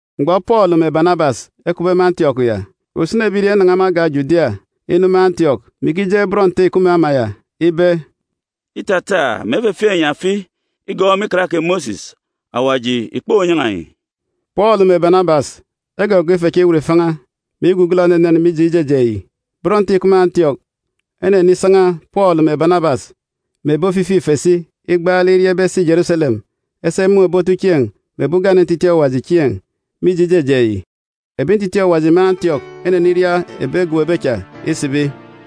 Mgbọ Pọọlu mè Banabas ekupbe me Antiọk ya, usini ebirieen̄ enanan̄a me agan̄ Judia inu me Antiọk, mè ikijeen̄ bọn Nte ìkup me ama ya ibe, “Îtata mè efefieek enyi afi igọọk me Ikan kè Mosis, Awaji ìkponyan̄a enyi.” Pọọlu mè Banabas egọgọọk ife cha iwut ifan̄a, mè igugọlọ enenen mije ijejeen̄ yi. Bọn Nte ìkup me Antiọk enenisan̄a Pọọlu mè Banabas mè ebi ofifi ife si igbaalek iria ibe esi Jeruselem esi emun̄ ebi otuchieen̄ mè ebi ugane ntitiin̄ Awaji chieen̄, mije ijejeen̄ yi. Ebi ntitiin̄ Awaji me Antiọk eneniria ebi egobobe cha isibi.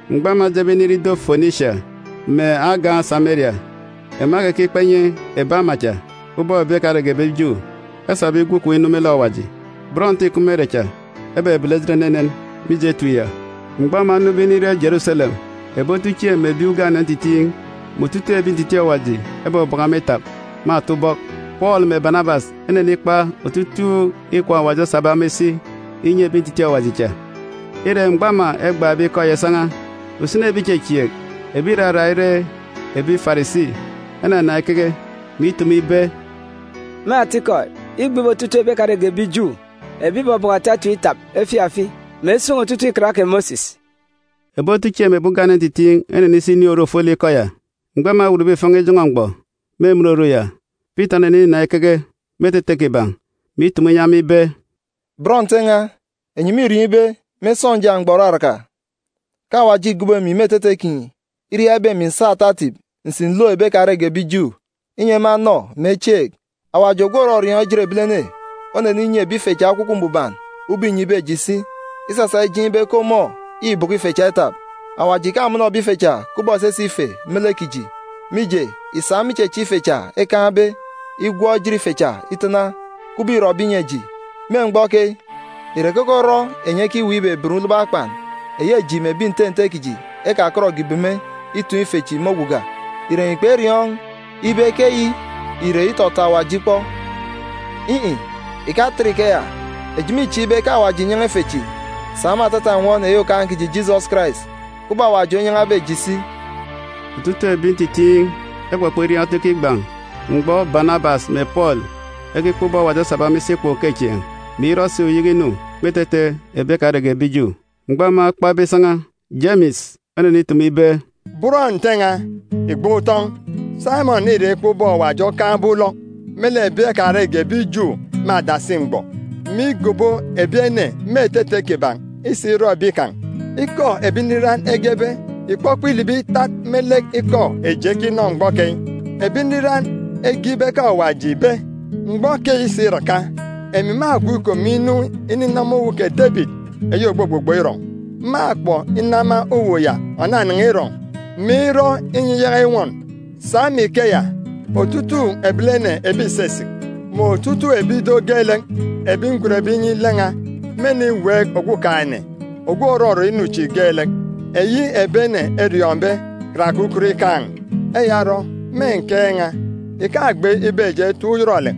Mgbọ ema ejebe inire ido Fonisia mè agan̄ Sameria, ema ekekikpa inyi ebi ama cha ubọk ebi ekarege ebi Ju esabe igwu ikom inu me lek Awaji. Bọn Nte ìkup me ere cha ebebele ejit enenen, mije etip ya. Mgbọ ema enube inire Jeruselem, ebi otuchieen̄ mè ebi ugane ntitiin̄ mè otutuuk ebi ntitiin̄ Awaji ebọbọkọ ema itap me ata ubọk. Pọọlu mè Banabas enenikpa otutuuk ikwaan̄ Awaji osabe ema isi inyi ebi ntitiin̄ Awaji cha. Ire, mgbọ ema egban̄be ikọ ya isan̄a, usini ebi ìchechieek, ebi ìrarak ire ebi Farisi, enanan̄a ikeke, mè itumu ibe, “Me atikọ, îgbe ibe otutuuk ebi ekarege ebi Ju, ebi ìbọbọkọ ata etip itap efieek afi, mè esun̄ otutuuk Ikan kè Mosis.” Ebi otuchieen̄ mè ebi ugane ntitiin̄ enenisi inin̄ oru ofolek ikọ ya. Mgbọ ema ewutbe ifan̄a ijọn̄ọ mgbọ me emen oru ya, Pita oneninan̄a ikeke me etete kiban̄, mè itumu inyi ema ibe, “Bọn Nte n̄a, enyi mîriọọn̄ ibe, me sọnja mgbọ òraraka, ke Awaji îgobo emi me etete kinyi iria ibe emi ǹsa ata etip ǹsi ǹlook ebi ekarege ebi Ju, inyi ema enọ, mè echieek. Awaji ogwu òrọriọọn̄ ejit ebilene oneninyi ebi ife cha Ekwukwu Mbuban ubọk înyibe eji si, isasa ijeen̄ ibe ke ọmọ îbọkọ ife cha itap. Awaji ìkamọnọ ebi ife cha kubọk esese ife me lek kiji, mije, ìsa me ichechieek ife cha ekaan̄be igwọk ejit ife cha itana, kubọk îrọbe inyi eji. Me mgbọ keyi, ìre keke orọ enyi ekiweek ibeben ulobo akpan, eyi eji mè ebi nte nte kiji ekakọtge ìbeme, itoon̄ ife chi me oguga? Ìre enyi kperiọọn̄ ibe ke eyi ìre itọtọ Awaji ikpọ? In̄-in̄, ìkatat ikeya. Eji mîchieek ibe ke Awaji ìnyan̄a ife chi sa me atata nnwọn eyi Okaan̄ kiji Jisọs Karais, kubọk Awaji onyan̄abe eji si.” Otutuuk ebi ntitiin̄ ekpọkpọ iriaan̄ otu ikigban̄ mgbọ Banabas mè Pọọlu ekikpa ubọk Awaji osabe ema isi ikwaan̄ ukechieen̄, mè irọ si uyeke inu me etete ebi ekarege ebi Ju. Mgbọ ema ekpabe isan̄a, Jemis onenitumu ibe, “Bọn Nte n̄a, ìgban̄ utọn̄! Saimọn îra ikpa ubọk Awaji okaan̄be ulọk me lek ebi ekarege ebi Ju me adasi mgbọ, mè igobo ebi ene me etete kiban̄ isa irọ ebi kan̄. Ikọ ebi nriran egebe ìkpọkpọ ilibi itat me lek ikọ eji ekinọ mgbọ keyi. Ebi nriran ege ibe ke Awaji ìbe, “ ‘Mgbọ keyi isiraka, emi mâgwu ikom inu ininama uwu kè Debit eyi ògbugbugbọ irọn̄. Mâkpọk inama uwu ya ònanan̄a irọn̄, mè irọ inyi iyaka inwọn. Sa me ikeya, otutuuk ebilene ebi ìsisik, mè otutuuk ebi ido geelek ebi ngwenbe inyi lek n̄a, mêniweek Okumugwem, eyi ebi ene eriọọn̄be karake ukot ikaan̄.’ “Eya orọ, me nkeek n̄a ìkagbe ibe eji etap uyọrọlek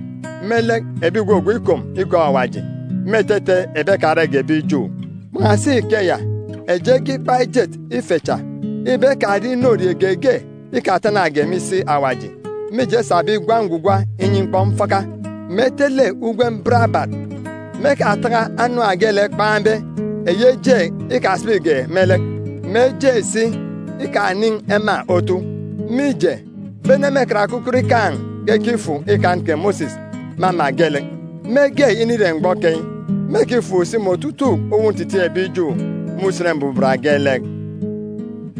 me lek ebi ìgwugwu ikom igọọk Awaji me etete ebi ekarege ebi Ju. Kpan̄asi ikeya, eji ege ikpa ejet ife cha ibe ekarie inorie geege ikatanage me isi Awaji mije esabe igwa ngwugwa inyi mkpọmfaka, mè etele ugwem barabat, mè ekataka anam geelek kpegwugwu isibi eje, mè eje si ikanin̄ ema otu. Mije, bene me karake ukot ikaan̄ ke ekifuk Ikan kè Mosis me ama geelek. Mege inire mgbọ keyi, mêkifuk si me otutuuk uwu ntitiin̄ ebi Ju me Usen Mbuban geelek.”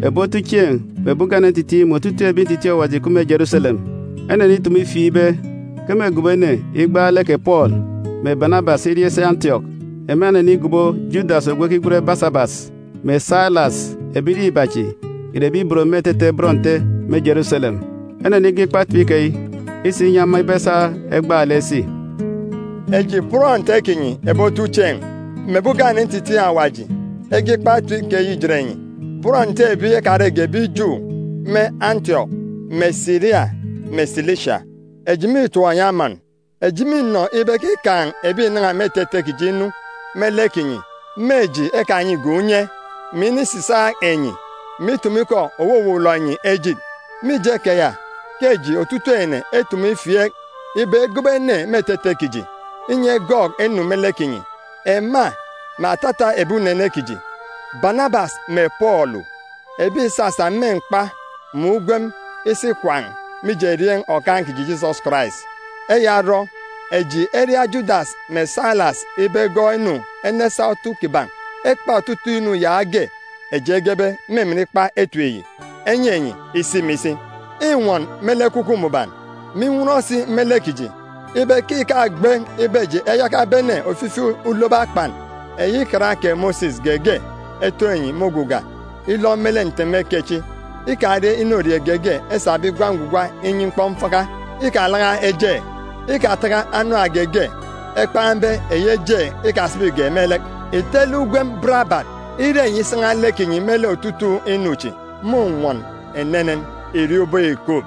Ebi otuchieen̄ mè ebi ugane ntitiin̄ mè otutuuk ebi ntitiin̄ Awaji ìkup me Jeruselem enenitumu ifieek ibe ke mêgobo ene igbaalek kè Pọọlu mè Banabas iria isi Antiọk. Ema enenigobo Judas ogwu ekigwen Basabas, mè Sailas. Ebirieen̄ iba chi ìre ebi ibot me etete bọn Nte me Jeruselem. Enenige ikpa etip keyi isa inyi ema ibe esa egbaalek esi: “Eji bọn Nte kinyi ebi otuchieen̄, mè ebi ugane ntitiin̄ Awaji ege ikpa etip keyi ijet enyi, bọn Nte ebi ekarege ebi Ju me Antiọk, mè Siria, mè Silisia. “Eji mîtọp enyi amọn! “Eji mînọ ibe ke îkaan̄ ebi ìnan̄a me etete kiji inu me lek kinyi me eji ekanyige unye, mè inisisaak enyi, mè itumu ikọ òwuwuwọlọ enyi ejit. Mije keya, ke eji otutuuk ene etumu ifieek ibe egobo ene me etete kiji, inyi egọọk enu me lek kinyi, ema mè atata ebi unene kiji, Banabas mè Pọọlu, ebi ìsasa me mkpa mè ugwem isi ikwaan̄ mije erieen̄ Okaan̄ kiji Jisọs Karais. Eya orọ, eji eria Judas mè Sailas ibe egọọk enu enesa otu kiban̄ ekpa otutuuk inu yaage eji egebe me emen ikpa etip yi enyi enyi isi mè isi. Înwọn me lek Ekwukwu Mbuban, mè inwọn si me lek kiji ibe ke ìkagbe ibe eji eyaka ebene ofifi ulobo akpan eyi Ikan kè Mosis geege etoon̄ enyi me oguga ilọ me lek nteme kechi: Ikarie inorie geege esabe igwa ngwugwa inyi mkpọmfaka. Ikalaka eje. Ikataka anam geege ekpan̄be eyi kpegwugwu isibi eje. Ìtele ugwem barabat. Ire enyi isan̄a lek kinyi me lek otutuuk inu chi, mônwọn enenen. “Ìriọọn̄ ubọk ìkup.”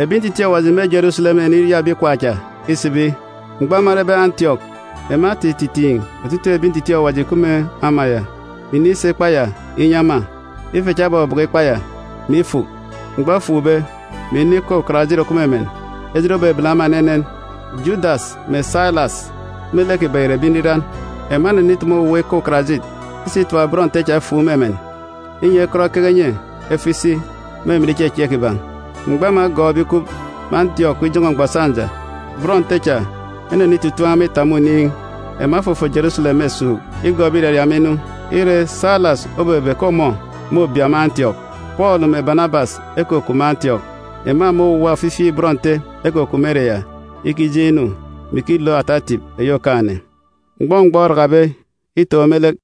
Ebi ntitiin̄ Awaji me Jeruselem eneniria ebi ikwaan̄ cha isibi. Mgbọ ema erebe Antiọk, ema etititiin̄ otutuuk ebi ntitiin̄ Awaji ìkup me ama ya, mè inisa ikpa ya inyi ema. Ife cha ebọbọkọ ikpa ya, mè ifuk. Mgbọ efukbe, mè inọ ikọ ukarajit òkup me emen, ejit obebele ema enenen. Judas mè Sailas me lek kiban̄ ìre ebi nriran. Ema enenitumu owuwa ikọ ukarajit isa itap bọn Nte cha efuuk me emen, inyi ekọt ekeke enye efo isi me emen ichechieek kiban̄. Mgbọ ema egọọkbe ikup me Antiọk ijọn̄ọ mgbọ sọnja, bọn Nte cha enenitutuun̄ ema itap me oniin̄. Ema efofon Jeruselem me esuuk, igọọk ebi ìraria ema inu. Ire, Sailas obebe ke ọmọ môbia me Antiọk. Pọọlu mè Banabas ekukup me Antiọk. Ema mè owuwa ofifi bọn Nte ekukup me ere ya ikijeen̄ inu, mè ikilook ata etip eyi Okaan̄-ene. Mgbọ mgbọ orakabe itoon̄ me lek,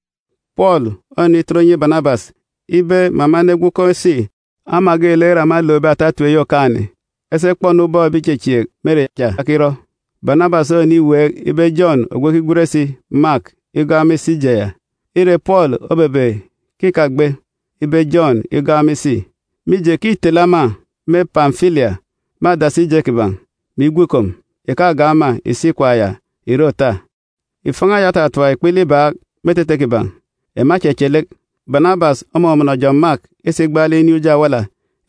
Pọọlu onenitọt inyi Banabas ibe mè ema enegwu ekom esi ama geelek ere ema elookbe ata etip eyi Okaan̄-ene, esi ekpọ-nu ubọk ebi ìchechieek me ere cha ekirọ. Banabas oneniweek ibe Jọn ogwu ekigwen si Mak igọọk ema isi ije ya. Ire, Pọọlu obebe ke ìkagbe ibe Jọn igọọk ema isi, mije ke îtele ema me Pamfilia me adasi ije kiban̄, mè igwu ikom, ìkagọọk ema ìsi ikwaan̄ ya ìre òta. Ifan̄a ya otatap ikpele ibaak me etete kiban̄, ema echeche lek. Banabas omọmọnọ Jọn Mak isa igbaalek inin̄ uji awala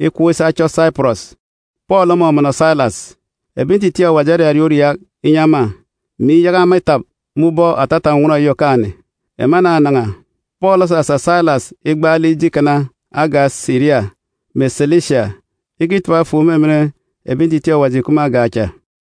ikọp isi achọ Saipọrọs. Pọọlu omọmọnọ Sailas. Ebi ntitiin̄ Awaji erariaak uriaak inyi ema, mè iyaka ema itap me ubọk atata nnwọn eyi Okaan̄-ene. Ema enanan̄a. Pọọlu osasa Sailas igbaalek ije ikana agan̄ Siria mè Silisia ikitap efuuk me emen ebi ntitiin̄ Awaji ìkup me agan̄ cha.